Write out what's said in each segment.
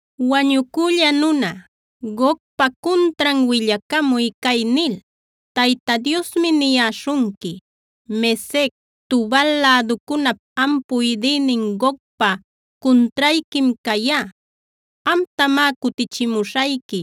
“Wañucülla nuna, Gogpa cuntran willacamuy cay nil: Tayta Diosmi niyäśhunqui: ‘Mesec, Tubal läducunap am puydïnin Gogpa cuntrayquim cayá. Amtamá cutichimuśhayqui,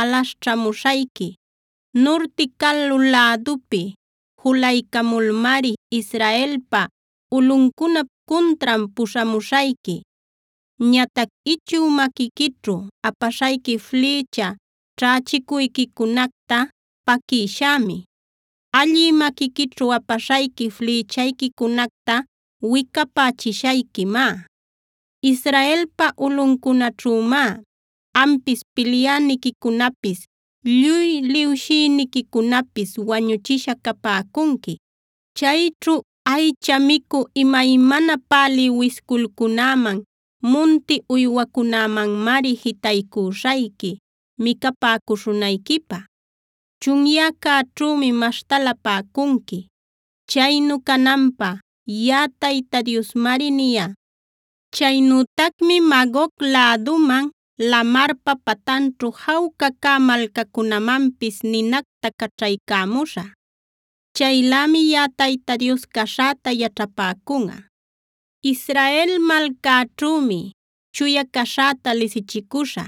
alaśhćhamuśhayqui. Nurti calu lädupi julaycamulmari Israelpa ulꞌuncunap cuntran puśhamuśhayqui. Ñatac ichü maquiquićhu apaśhayqui flïcha ćhächicuyquicunacta paquïshämi. Allï maquiquićhu apaśhayqui flïchayquicunacta wicapächishayquimá. Israelpa ulꞌuncunaćhümá ampis, pilyäniquicunapis, lluy liwshïniquicunapis wañuchisha capäcunqui. Chayćhu aycha micü imaymana pälï wisculcunäman, munti uywacunämanmari, jitaycüśhayqui micapäcuśhunayquipä. Chunyäcäćhümi maśhtalapäcunqui. Chaynu cananpä yaꞌa Tayta Diosmari niyá. “ ‘Chaynütacmi Magog läduman, lamarpa patanćhu jawca cä malcacunämanpis ninacta caćhaycämuśhä. Chaylämi yaꞌa Tayta Dios caśhäta yaćhapäcunꞌa. “ ‘Israel malcäćhümi chuya caśhäta lisichicuśhä.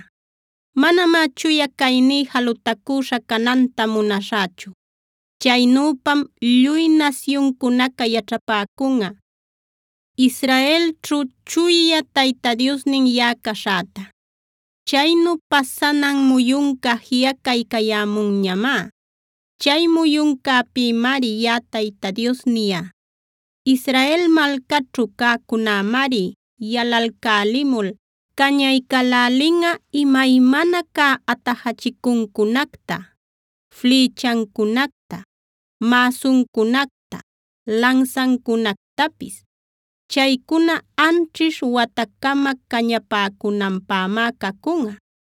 Manamá chuya cayní jalutacüśha cananta munaśhächu. Chaynüpam lluy nasyuncunaca yaćhapäcunꞌa Israelćhu Chuya Tayta Diosnin yaꞌa caśhäta. Chaynu pasanan muyunca jiꞌacaycayämunñamá. Chay muyuncäpïmari yaꞌa Tayta Dios niyá. “ ‘Israel malcaćhu cäcunämari yalalcälimul cañaycälälinꞌa imaymana cä atajachicuncunacta, flïchancunacta, mäsuncunacta, lansancunactapis. Chaycuna anćhish watacama cañapäcunanpämá cacunꞌa.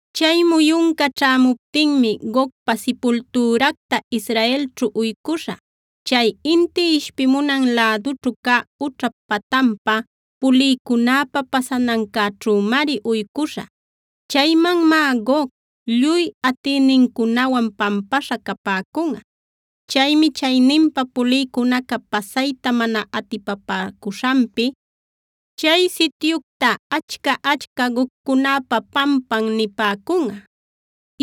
“ ‘Chay muyunca ćhämuptinmi Gogpa sipultüracta Israelćhu uycuśhä. Chay inti ishpimunan lädućhu cä ućhap patanpa pulïcunäpa pasanancäćhümari uycuśhä. Chaymanmá Gog, lluy atïnincunawan pampaśha capäcunꞌa. Chaymi chayninpa pulïcunaca pasayta mana atipapäcuśhanpi, chay sityucta Achca-achca Gogcunäpa pampan nipäcunꞌa.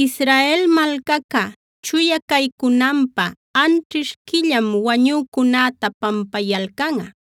Israel malcaca chuya caycunanpä, anćhish quillam wañücunäta pampayalcanꞌa.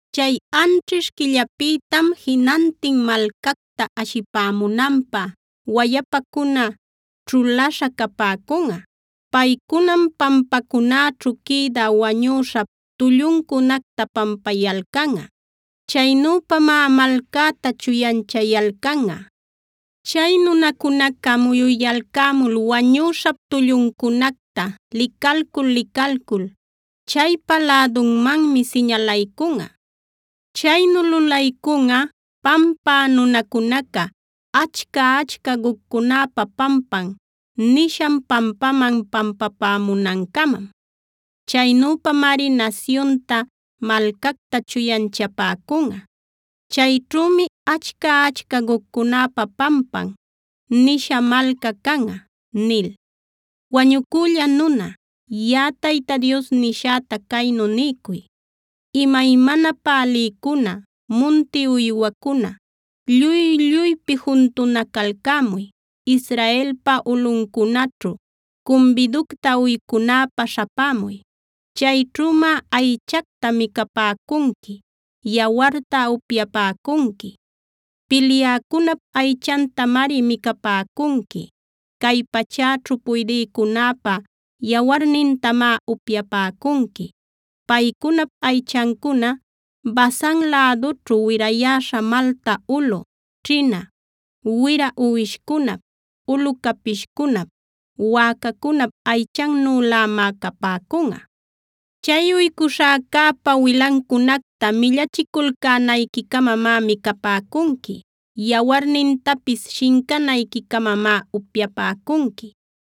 “ ‘Chay anćhish quillapïtam jinantin malcacta ashipämunanpä wayapacuna ćhulaśha capäcunꞌa. Paycunam pampacunäćhu quïdä wañüśhap tulluncunacta pampayalcanꞌa. Chaynüpamá malcäta chuyanchayalcanꞌa. Chay nunacunaca muyuyalcämul wañüśhap tulluncunacta licalcul-licalcul, chaypa lädunmanmi siñalaycunꞌa. Chaynu lulaycunꞌa pampä nunacunaca “Achca-achca Gogcunäpa pampan” nishan pampaman pampapämunancamam. Chaynüpamari nasyunta, malcacta chuyanchapäcunꞌa. Chayćhümi “achca-achca Gogcunäpa pampan” nisha malca canꞌa’ nil. “Wañucülla nuna, yaꞌa Tayta Dios nishäta caynu niycuy: ‘Imaymana pälïcuna, munti uywacuna lluy-lluypi juntunacalcämuy. Israelpa ulꞌuncunaćhu cumbiducta uycunäpä śhapämuy. Chayćhümá aychacta micapäcunqui; yawarta upyapäcunqui. Pilyäcunap aychantamari micapäcunqui. Cay pachäćhu puydïcunäpä yawarnintamá upyapäcunqui. Paycunap aychancuna Basan lädućhu wirayäśha malta ulu, ćhina, wira uwishcunap, ulu capishcunap, wäcacunap aychannülämá capäcunꞌa. Chay uycuśhäcäpa wilancunacta millachiculcänayqui-camamá micapäcunqui. Yawarnintapis shincanayqui-camamá upyapäcunqui.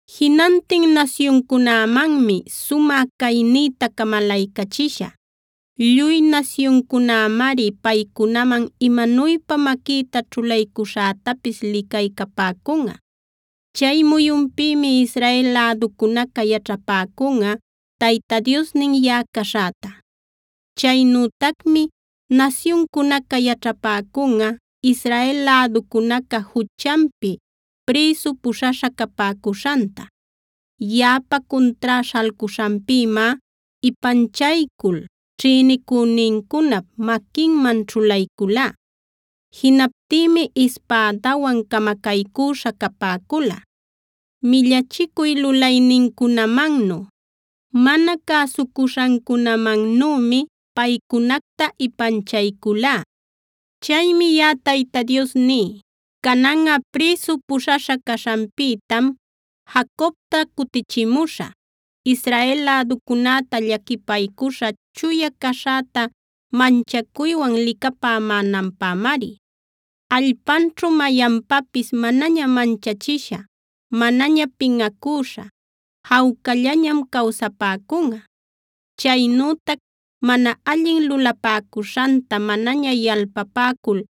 “Jinantin nasyuncunämanmi sumä caynïta camalaycachishä. Lluy nasyuncunämari paycunaman imanuypa maquïta ćhulaycuśhätapis licaycapäcunꞌa. Chay muyunpïmi Israel läducunaca yaćhapäcunꞌa Tayta Diosnin yaꞌa caśhäta. Chaynütacmi nasyuncunaca yaćhapäcunꞌa Israel läducunaca juchanpi prïsu puśhaśha capäcuśhanta. Yaꞌapa cuntrá śhalcuśhanpïmá ipanchaycul ćhïnicünincunap maquinman ćhulaycülá. Jinaptïmi ispädawan camacaycüśha capäcula. Millachicuy lulaynincunamannu, mana cäsucuśhancunamannümi paycunacta ipanchayculá. “Chaymi yaꞌa Tayta Dios ní: Cananꞌa prïsu puśhaśha caśhanpïtam Jacobta cutichimuśhä. Israel läducunäta llaquipaycuśhä chuya caśhäta manchacuywan licapämänanpämari. Allpanćhu mayanpapis manaña manchachisha, manaña pinꞌacüśha jawcallañam cawsapäcunꞌa. Chaynütac mana allin lulapäcuśhanta manaña yalpapäcul,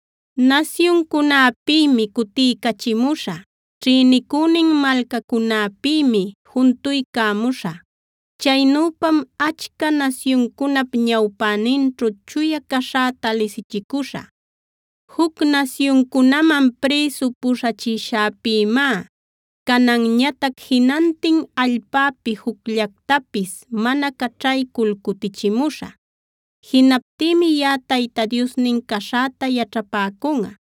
Nasyuncunäpïmi cutiycachimuśhä; ćhïnicünin malcacunäpïmi juntuycamuśhä. Chaynüpam achca nasyuncunap ñawpäninćhu chuya caśhäta lisichicuśhä. Juc nasyuncunaman prïsu puśhachishäpïmá cananñatac jinantin allpäpi jucllactapis mana caćhaycul cutichimuśhä. Jinaptïmi yaꞌa Tayta Diosnin caśhäta yaćhapäcunꞌa.